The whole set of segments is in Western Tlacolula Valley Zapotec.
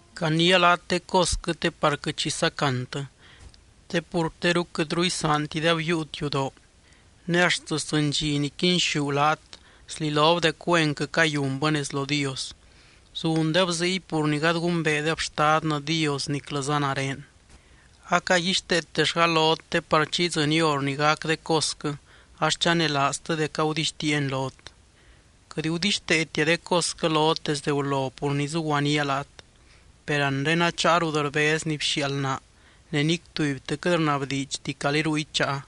’Caniia laat de cosquɨ te par quɨt xi sacantɨ. Te pur teru quɨtru isaantideb yiiut yudoo, ne axt sdzɨny dxi ni quinxú laat, slilob dec güenquɨ cayunbɨ nez lo Dios. Zundeb ziy, pur ni gady gumbeedeb Xtadnɨ Dios niclɨza nare. Acaguixteetellga lot te par chi idzɨny hor ni gac de cosquɨ ax chanelaaztɨ dec agudixtiiani lot. ’Quɨt gudixteetia de cosquɨ lot desdɨ gulo pur ni zuguaníaa laat. Per anre acháa rut rbez ni bxiaald naa, ne nic tubytɨ quɨt rnabdiidxti calí ruy cháa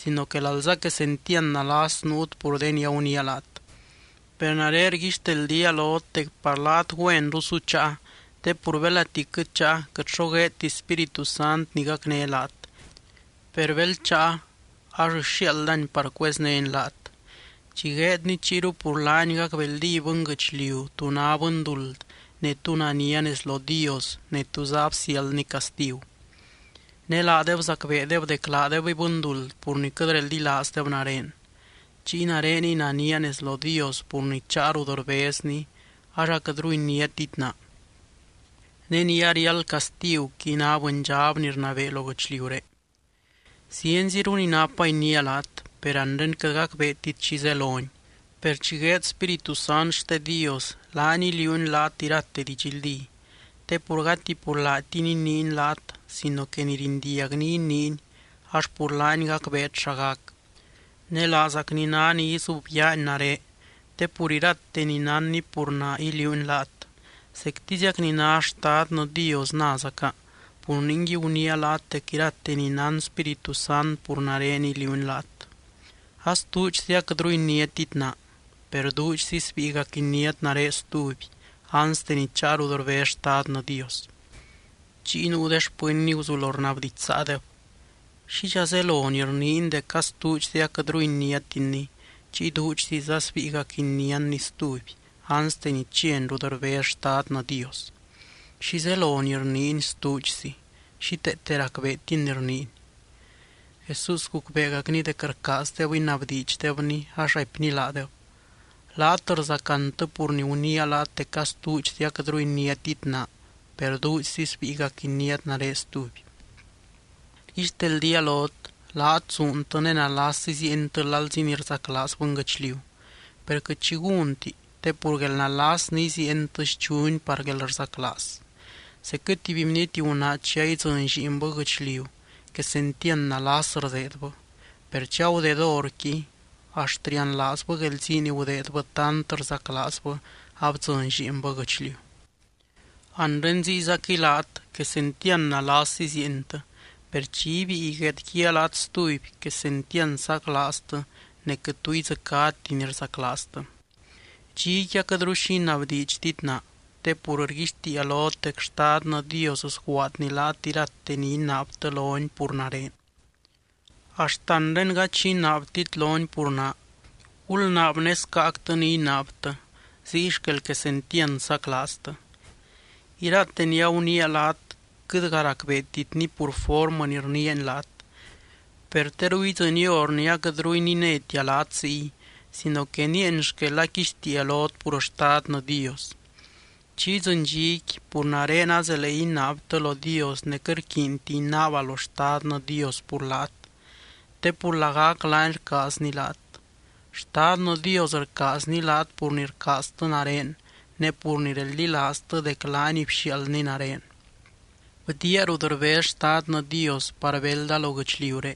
sino que alza quesentiand nalas nuut pur de ni aguniia laat. Per nare rguixteldía lot dec par laat güenru su cháa, te pur belati quɨt cháa, quɨt xo gueedti Spíritu Sant ni gacné laat. Per bel cháa, ax sxiaaldany par cueznény laat. Chi gueedny chiyru pur laany gacbeldí bɨnguɨchliu tú ná bɨnduld ne tú nania nez lo Dios ne túza absiáldny castigu. Ne laadeb zacbeedeb dec laadebɨy bɨnduld pur ni quɨt reldilaazdeb nare. Chiy nareniy nania nez lo Dios pur ni cháa rut rbezny, ax aquɨtru iniátit naa. Ne ni ariáld castiguqui ná bɨndxab ni rnabee lo guɨchliuré. ’Zienziru ni napa iniia laat, per anre quɨt gacbeetit xi zeloni. Per chi gueed Spíritu Sant xte Dios, laany iliuuny laat irate didxldí. Te pur gati pur laatiny iniiny laat sino que ni rindiagny iniiny ax pur laany gacbeet xa gac. Ne laazacny ná ni izubyaany nare, te pur irate ni nánny pur naa iliuuny laat. Zectiziac ni ná Xtadnɨ Dios názaca. Pur ningui, guniia laat dec irate ni nán Spíritu Sant pur nare iliuuny laat. ’Astuudxzi aquɨtru iniátit naa, per duudxzi sbíigac iniát nare stuby, anste ni cháa rut rbez Xtadnɨ Dios. Chiy nuu de xpɨnny guzulo rnabdidxsaadeb: —¿Xidxa zelo ni rniiny dec astuudxzi aquɨtru iniátinny, chiy duudxziza sbíigac iniánny stuby, anste ni chiany rut rbez Xtadnɨ Dios? ¿Xi zelo ni rniiny, “stuudxzi”? Xíteete racbeetin ni rniiny. Jesús gucbeegacny dec rcaazdeb inabdiidxdebny, ax raipny laadeb: —Laat rzacantɨ pur ni guniia dec astuudxzi aquɨtru iniátit naa per duudxzi sbíigac iniát nare stuby. Rguixteldía lot, laat zuuntɨ ne nalas iziientɨ lalzi ni rzaclaaz bɨnguɨchliu. Per quɨt xi gúnti, te pur guelnalas ni iziientɨ schuni par guelrzaclaaz. Zecquɨ tuby bniety gunaa chi a idzɨny lliinbɨ guɨchliu quesentiand nalas rdeedbɨ. Per chi agudeed horqui, axt rianlaazbɨ guelzii ni gudeedbɨ tant rzaclaazbɨ abdzɨny lliinbɨ guɨchliu. Anre ziyzaquɨy laat, quesentiand nalas iziientɨ. Per chi ibíi guedguíaa laat stuby, quesentiand saclaaztɨ ne quɨt tu idzɨcáti ni rzaclaaztɨ. ’Dxiqui aquɨtru xi inabdiidxtit naa. Te pur rguixtiia lot dec Xtadnɨ Dios sguaadny laat irate ni inaabtɨ lony pur nare. Axt anre gady xi inaabtit lony pur naa. Gulnaab ne scáactɨ ni inaabtɨ, ziy xquel quesentiand saclaaztɨ. ’Irate ni aguniia laat quɨtga racbeetitni pur formɨ ni rniiani laat. Per teru idzɨny hor ni aquɨtru ininétia laat ziy sino que nieeny xquel aquixtiia lot pur Xtadnɨ Dios. Chi idzɨny dxiqui pur nare azelee inaabtɨ lo Dios ne quɨt rquiinti inaaba lo Xtadnɨ Dios pur laat te pur lagac laany rcaazny laat. Xtadnɨ Dios rcaazny laat pur ni rcaaztɨ nare ne pur ni reldilaaztɨ dec laany bxiaaldny nare. Bdiaa rut rbez Xtadnɨ Dios par belda lo guɨchliuré,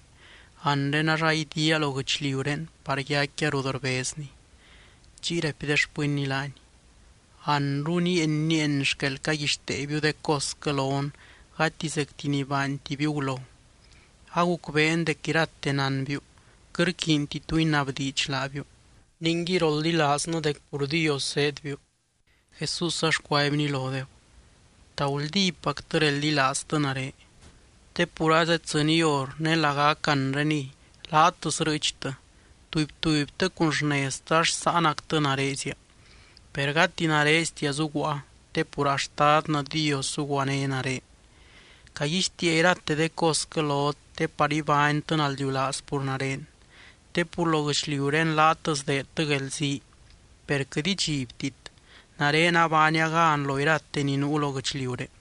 anre ax aidiaa lo guɨchliuré par yaicquia rut rbezny. Chiy raipy de xpɨnny laany: —Anru nieeny, nieeny xquel caguixteebiu de cosquɨ lon gati zecti ni baantibiu gulo. Agucbeen dec irate nánbiu. Quɨt rquiinti tu inabdiidx laabiu. Ningui roldilaaznɨ dec pur Dios zéedbiu. Jesús ax cuaibny lodeb: —¿Ta guldípactɨ reldilaaztɨ nare? Te pur azeddzɨny hor ne lagac anreniy, laat srɨɨchtɨ, tuby tubytɨ cun xneztɨ ax sáanactɨ narezia. Per gati nareztia zuguaa te pur a Xtadnɨ Dios zuguané nare. Caguixtiia irate de cosquɨ lot te par ibánytɨ naldiulaaz pur nare. Te pur lo guɨchliuré laat sdeedtɨ guelzii, per quɨt idxibtit, nare abaania gan lo iralote ni nuu lo guɨchliuré.